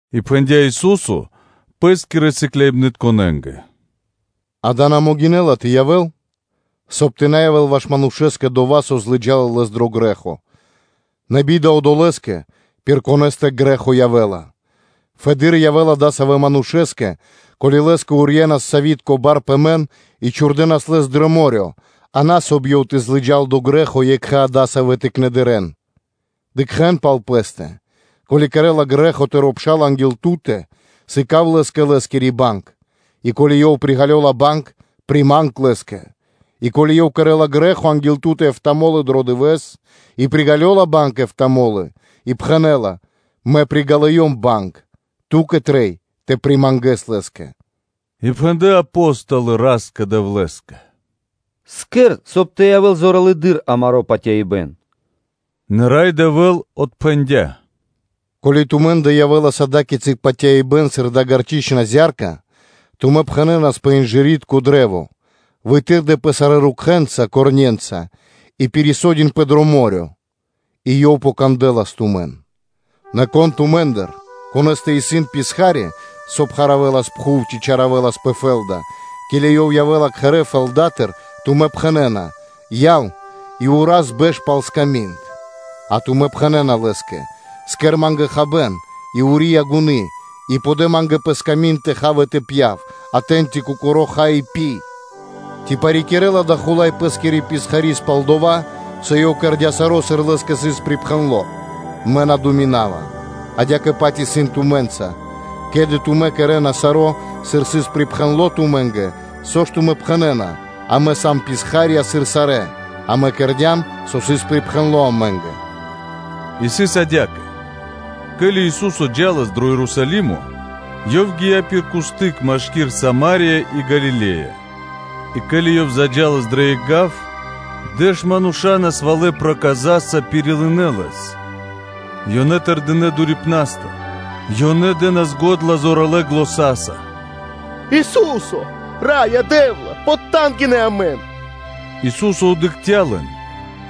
И пхэндя́ Ису́со Пэ́скирэ сыкляибнытконэ́нгэ: “Дава́ на могинэ́ла тэ явэ́л, соб (кай) тэ на явэ́л ваш манушэ́скэ дова́, со злыджала лэс дро грэ́хо, нэ би́да одолэ́скэ, пир конэ́стэ грэ́хо явэ́ла! Фэды́р явэ́лас адасавэ́ манушэ́скэ, ко́ли лэ́скэ урьенас сявитко (мельницытко) бар пэ мэн и чхурдэнас лэс дро мо́рё (дэрья́в), а на, соб (кай) ёв тэ злыджал дро грэ́хо екхэ адасавэ́ тыкнэндыр. Дыкхэ́н пал пэ́стэ. Ко́ли кэрэ́ла грэ́хо тыро́ пшал анги́л ту́тэ, сыка́в лэ́скэ лэ́скири банг; и ко́ли ёв приґалёла банг, приманг лэ́скэ. И ко́ли ёв кэрэ́ла грэ́хо анги́л ту́тэ эфта́ (битринэ́нгиро дэш) мо́лы дро дывэ́с и приґалёла банг эфта́ мо́лы и пхэнэ́ла: ‘Мэ приґалёва банг,’ трэй ту́кэ тэ примангэс лэ́скэ.” И пхэндлэ́ Апо́столы Ра́скэ-Дэвлэ́скэ: “Кэр, соб (кай) тэ явэ́л зоралэды́р амаро́ патяибэ́н.” Нэ Рай Дэвэ́л отпхэндя́: “Ко́ли тумэ́ндэ явэ́лас ада́кицы патяибэ́н сыр дая́ гарчыцытко зя́рка, тумэ́ пхэнэнас пэ дава́ инжыритко кашт: ‘Вытырдэпэ сарэ́ корне́нца (рукхэ́нца) и пирисодинпэ дро мо́рё (дэрья́в)!’ – и ёв покандэлас тумэн. Нэ кон тумэ́ндыр, конэ́стэ исын писха́ри, саво́ пхаравэлас (пашынэлас) пхув ци чаравэлас пэ фэ́лда, ке́ли ёв явэ́ла кхэрэ́ фэлдатыр, соб (кай) тэ пхэнэ́ла: ‘Яв и ўраз бэш пал сками́нд?’ А тумэ́ пхэнэ́на лэ́скэ: ‘Кэр ма́нгэ хабэ́н, и ури янгуны (фартуха) и подэ ма́нгэ пэ сками́нд тэ хав и тэ пья́в; а тэ́ньчи кокоро́ ха и пи?’ Ци парикирэла дава́ хула́й пэ́скирэ писхари́скэ пал дова́, со ёв кэрдя́ саро́, сыр лэ́скэ сыс припхэндло? Мэ на думинава. Адя́кэ-паць исын тумэ́нца: ке́ли тумэ́ кэрэ́на саро́, сыр сыс припхэндло тумэ́нгэ, со ж тумэ́ пхэнэ́на: ‘Амэ сам писха́рья сыр сарэ́; амэ кэрдя́м, со сыс припхэндло амэ́нгэ.’” И сыс адя́кэ: ке́ли Ису́со джа́лас дро Ерусалимо, Ёв гия́ пир кусты́к (граница) машки́р Сама́рия и Галиле́я. И ке́ли Ёв заджалас дро екх гав, дэш мануша́ насвалэ проказаса пирилынэ Лэс, и ёнэ тэрдинэ́ дурипнастыр. Ёнэ дэ́нас го́дла зоралэ́ заня́са: “Ису́се! Раё Дэ́вла, потангинэ амэн.” Ису́со дыкхця́ лэн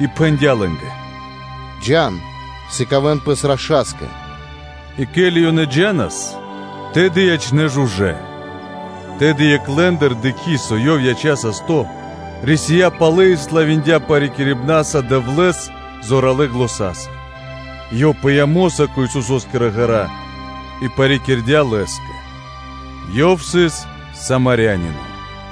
и пхэндя́ лэ́нгэ: “Джа́н, сыкавэ́н пэс раша́скэ.” И ке́ли ёнэ джа́нас, тэды ячнэ́ жужэ́. Тэды екх лэ́ндыр, дыкхи́, со ёв яця́ састо́, рисия́ палэ и славиндя парикирибнаса Дэвлэ́с зоралэ́ заня́са, и ёв пыя́ мо́са кэ Исусо́скирэ ґэра́ и парикирдя Лэ́скэ; ёв сыс Самарянино.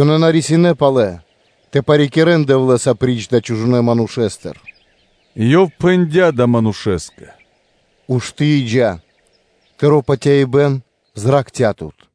Ёнэ на рисинэ́ палэ тэ парикирэ́н Дэвлэ́с апри́ч адалэ́ чужонэ́ манушэ́стэ. И Ёв пхэндя́ адалэ́ манушэ́скэ: “Ушты́ и джа́, тыро́ патяибэ́н зракхця́ тут.”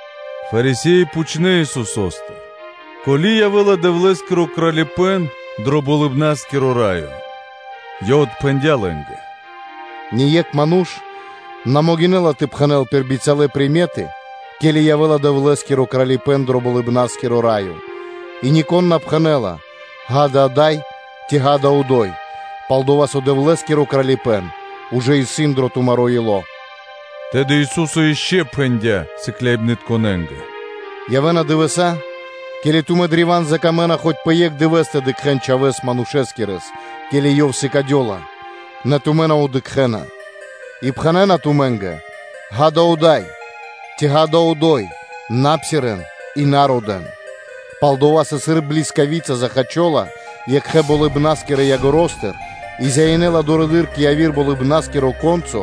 Фарисе́и пхучнэ́ Исусо́стыр, ке́ли явэ́ла Дэвлэ́скиро Кралипэ́н дро Болыбна́скиро Раё. Ёв отпхэндя́ лэ́нгэ: “Ние́кх ману́ш на могинэ́ла тэ пхэнэ́л пир бицялэ шпэры (приметы), ке́ли явэ́ла Дэвлэ́скиро Кралипэ́н дро Болыбна́скиро Раё; и нико́н на пхэнэ́ла: ‘Ѓа́да, ада́й,’ ци ‘ґа́да, одо́й,’ пал-дова́ со Дэвлэ́скиро Кралипэ́н ужэ исын дро тумаро́ ило́.” Тэды Ису́со ишчо (инкэ́) пхэндя́ сыкляибнытконэ́нгэ: “Явэ́на дывэса́, ке́ли тумэ́ древа́н закамэна хоць пэ екх дывэ́с тэ дыкхэ́н Чхавэ́с Манушэскирэс, ке́ли Ёв сыкадёла, нэ тумэ́ на дыкхэ́на; и пхэнэ́на тумэ́нгэ: ‘Ѓа́да, ада́й,’ ци ‘ґа́да, одо́й,’ – на псирэ́н и на родэ́н; пал-дова́ со, сыр блискавица захачола екхэ-болыбна́скирэ ягоро́стыр (краёстыр) и зяинэла дурэды́р кэ яви́р Болыбна́скиро яго́ро (ко́нцо),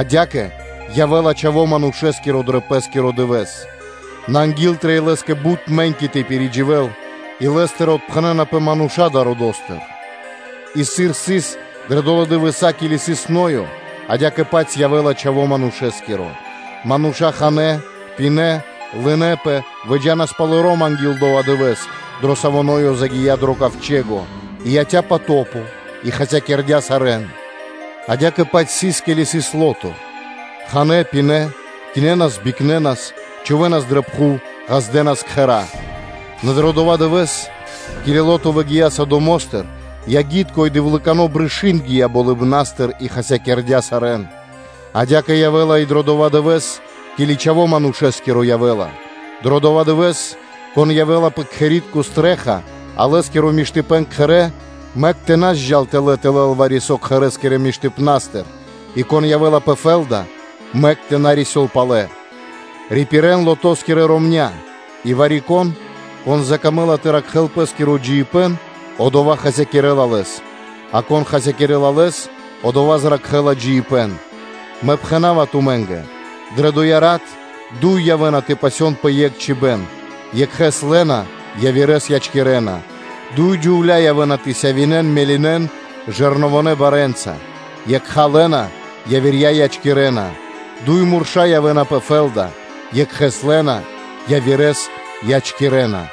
адя́кэ явэ́ла Чхаво́ Манушэ́скиро дро Пэ́скиро дывэ́с. Нэ анги́л трэй Лэ́скэ бут мэ́ньки тэ пиридживэл и Лэ́стыр отпхэнэнапэ мануша́ далэ́ родо́стыр, И, сыр сыс дрэ долэ́ дывэса́, ке́ли сыс Ноё, адя́кэ-паць дрэ дывэса́ явэ́ла Чхаво́ Манушэ́скиро: мануша́ ханэ́, пинэ́, лынэпэ, выджа́нас палоро́м анги́л дова́ дывэ́с, дро саво́ Ноё загия́ дро ковчэго, и яця́ потопо и хасякирдя́ сарэ́н; адя́кэ-паць сыр сыс, ке́ли сыс Лото: ханэ́, пинэ́, кинэнас, бикнэнас, чхувэ́нас дрэ пхув, ґаздэнас кхэра́; нэ дро дова́ дывэ́с, ке́ли Лото выгия́ Содомостыр, ягитко и дзэвэликано́ (серно) брышы́нд гия́ болыбна́стыр и хасякирдя́ сарэ́н; Адя́кэ явэ́ла и дро дова́ дывэ́с, ке́ли Чхаво́ Манушэ́скиро явэ́ла. Дро дова́ дывэ́с, кон явэ́ла пэ кхэри́тко стрэ́ха (чхаки́н), а Лэ́скиро миштыпэ́н кхэрэ́, мэк тэ на зджал тэлэ́ тэ лэл вари-со кхэрэ́скирэ миштыпна́стыр и кон явэ́ла пэ фэ́лда, мэк тэ на рисёл палэ. Рипирэн Лотоскирья ромня́. И вари-кон, кон закамэ́ла тэ ракхэ́л пэ́скиро джиибэ́н, одова́ хасякирэ́ла лэс, а кон хасякирэ́ла лэс, одова́ зракхэ́ла джиибэ́н. Мэ пхэна́ва тумэ́нгэ: дрэ доя́ рат дуй мануша́ явэ́на тэ пасён пэ екх чхуибэ́н: екхэ́с лэ́на, явирэ́с ячкирэна; дуй джувля́ явэ́на тэ сявинэн (тэ мелинэн) жэрновонэ барэ́нца; екха лэ́на, явирья ячкирэна, дуй мурша́ явэ́на пэ фэ́лда: екхэ́с лэ́на, явирэ́с ячкирэна.